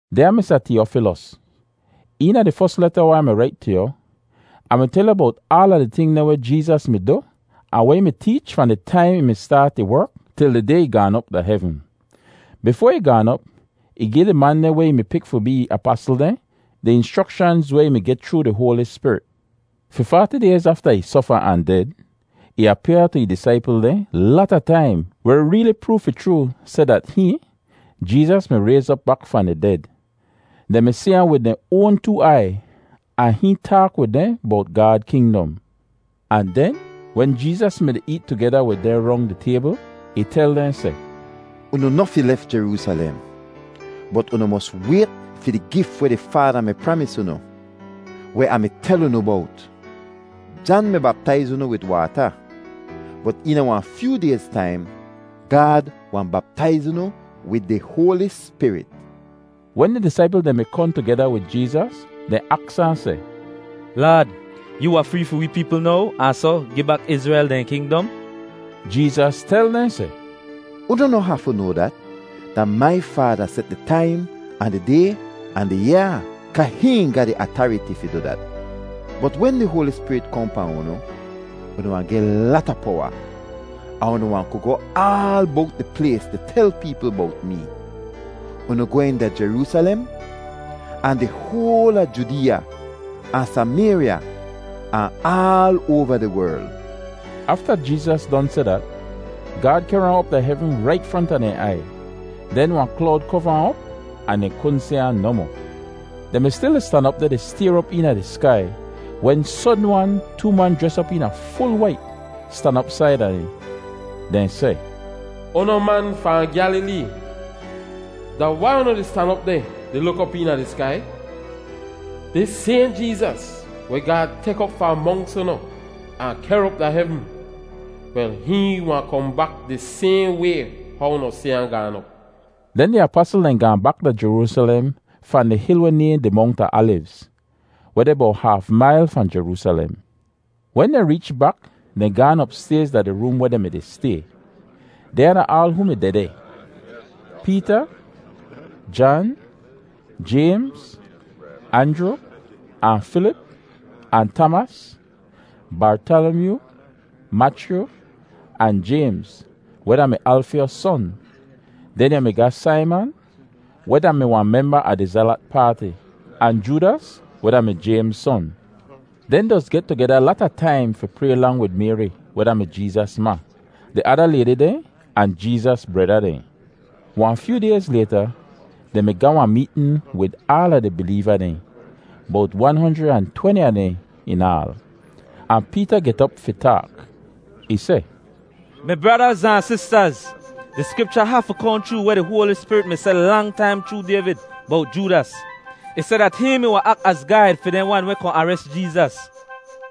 Dyaa Misa Tiyofilos, Eena di fos leta weh Ah mi rait tu yu, Ah mi tel yu bowt aala di ting dehn weh Jeezas mi du ahn weh ih mi teech fahn di taim ih mi staat ih werk, til di day ih gaan op da hevn. Bifoa ih gaan op, ih gi di man dehn weh ih mi pik fi bee ih apasl dehn di inschrokshanz weh ih mi geh chroo di Hoali Spirit. Fi faati dayz afta ih sofa ahn ded, ih apyaa tu ih disaipl dehn lata taim weh reeli proov fi chroo seh dat hihn, Jeezas, mi rayz op bak fahn di ded. Dehn mi si ahn wid dehn oan too aiy ahn hihn taak wid dehn bowt Gaad kingdom. Ahn den, wen Jeezas mi-di eet tugeda wid dehn rong di taybl, ih tel dehn seh, “Unu noh fi lef Jeroosalem, bot unu mos wayt fi di gif weh di Faada mi pramis unu, weh Ah mi tel unu bowt. Jan mi baptaiz unu wid waata, bot eena wahn fyoo dayz taim, Gaad wahn baptaiz unu wid di Hoali Spirit.” Wen di disaipl dehn mi kohn tugeda wid Jeezas, dehn aks ahn seh, “Laad, yoo wahn free fi wee peepl now ahn soh gi bak Izrel dehn kingdom?” Jeezas tel dehn seh, “Unu noh hafu noa dat. Da mai Faada set di taim ahn di day ahn di yaa kaa hihn ga di atariti fi du dat. Bot wen di Hoali Spirit kohn pahn unu, unu wahn geh lata powa, ahn unu wahn ku goh aal bowt di plays di tel peepl bowt mee. Unu gwehn da Jeroosalem, ahn di hoal a Judeeya ahn Samayrya, ahn aal oava di werl.” Afta Jeezas don seh dat, Gaad kehr ahn op da hevn rait fronta dehn aiy. Den wahn klowd kova ahn op ahn dehn kudn si ahn nohmoh. Dehn mi stil di stan op deh di stayr op eena di skai, wen sodn-wan too man jres op eena ful wait stan op saida dehn. Dehn seh, “Unu man fahn Gyalilee, da wai unu di stan op deh di luk op eena di skai? Dis sayhn Jeezas weh Gaad tek op fahn monks unu ahn kehr op da hevn, wel hihn wahn kohn bak di sayhn way how unu si ahn gaan op.” Den di apasl dehn gaahn bak da Jeroosalem fahn di hil weh nayhn di Mongt a Alivz, weh deh bowt haaf mail fahn Jeroosalem. Wen dehn reech bak, dehn gaan opstayz da di room weh dehn mi-di stay. Dehnya da aal hoo mi dehdeh: Peeta, Jan, Jaymz, Anjru, ahn Filip, ahn Tamas, Bartalamyoo, Machyu, ahn Jaymz, weh da-mi Alfyos son; den yu mi ga Saiman weh da-mi wahn memba a di Zelat Paati, ahn Joodas, weh da-mi Jaymz son. Dehn doz get tugeda lata taim fi pray lang wid Mayri weh da-mi Jeezas ma, di ada laydi dehn, ahn Jeezas breda dehn. Wahn fyoo dayz layta, dehn mi ga wahn meetn wid aala di bileeva dehn, bowt wan honjrid ahn tweni a dehn in aal. Ahn Peeta get op fi taak. Ih seh, “Mi bradaz ahn sistaz, di Skripcha hafu kohn chroo weh di Hoali Spirit mi seh lang taim chroo Dayvid bowt Joodas. Ih seh dat hihn mi wahn ak az gaid fi dehn wan weh kohn ares Jeezas.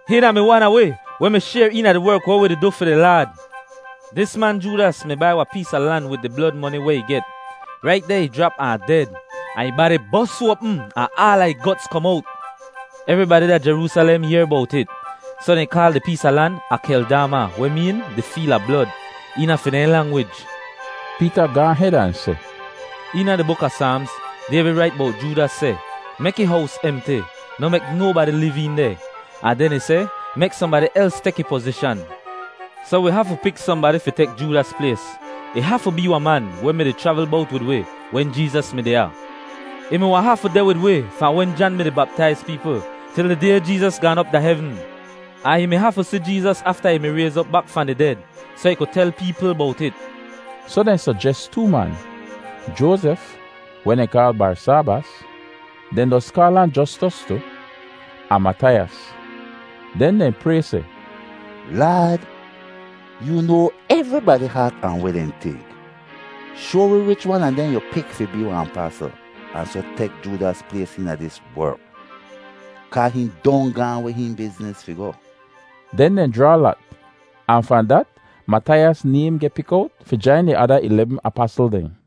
Hihn da-mi wan a wi, weh mi shayr eena di werk weh wi di du fi di Laad.” (Dis man Joodas mi bai wahn pees a lan wid di blod moni weh ih get. Rait deh ih jrap ahn ded, ahn ih badi bos oapm ahn aala ih gots kom owt. Evribadi da Jeroosalem yehr bowt it, soh dehn kaal di pees a lan Akeldama, weh meen “Di Feel a Blod” eena fi dehn langwij.) Peeta gaahn hed ahn seh, “Eena di buk a Saamz, Dayvid rait bowt Joodas seh, ‘Mek ih hows emti, noh mek nobadi liv een deh.’ Ahn den ih seh, ‘Mek sohnbadi els tek ih pozishan.’ “Soh wi hafu pik sohnbadi fi tek Joodas plays. Ih hafu bee wahn man weh mi-di chravl bowt wid wi wen Jeezas mi deh ya. Ih mi wahn hafu deh wid wi fahn wen Jan mi-di baptaiz peepl, til di day Jeezas gaan op da hevn; ahn ih mi hafu si Jeezas afta ih mi rayz op bak fahn di ded, soh ih ku tel peepl bowt it.” Soh dehn sojes too man: Joazef, weh dehn kaal Barsaabas (dehn doz kaal ahn Jostos tu), ahn Mataiyas. Den dehn pray seh, “Laad, yoo noa evribadi haat ahn weh dehn tink. Shoa wi wich wan a dehn yu pik fi bee wahn apasl ahn soh tek Joodas plays eena dis werk, kaa hihn don gaahn weh ih bizniz fi goh.” Den dehn jraa lat, ahn fahn dat Mataiyas naym geh pik owt fi jain di ada ilebm apasl dehn.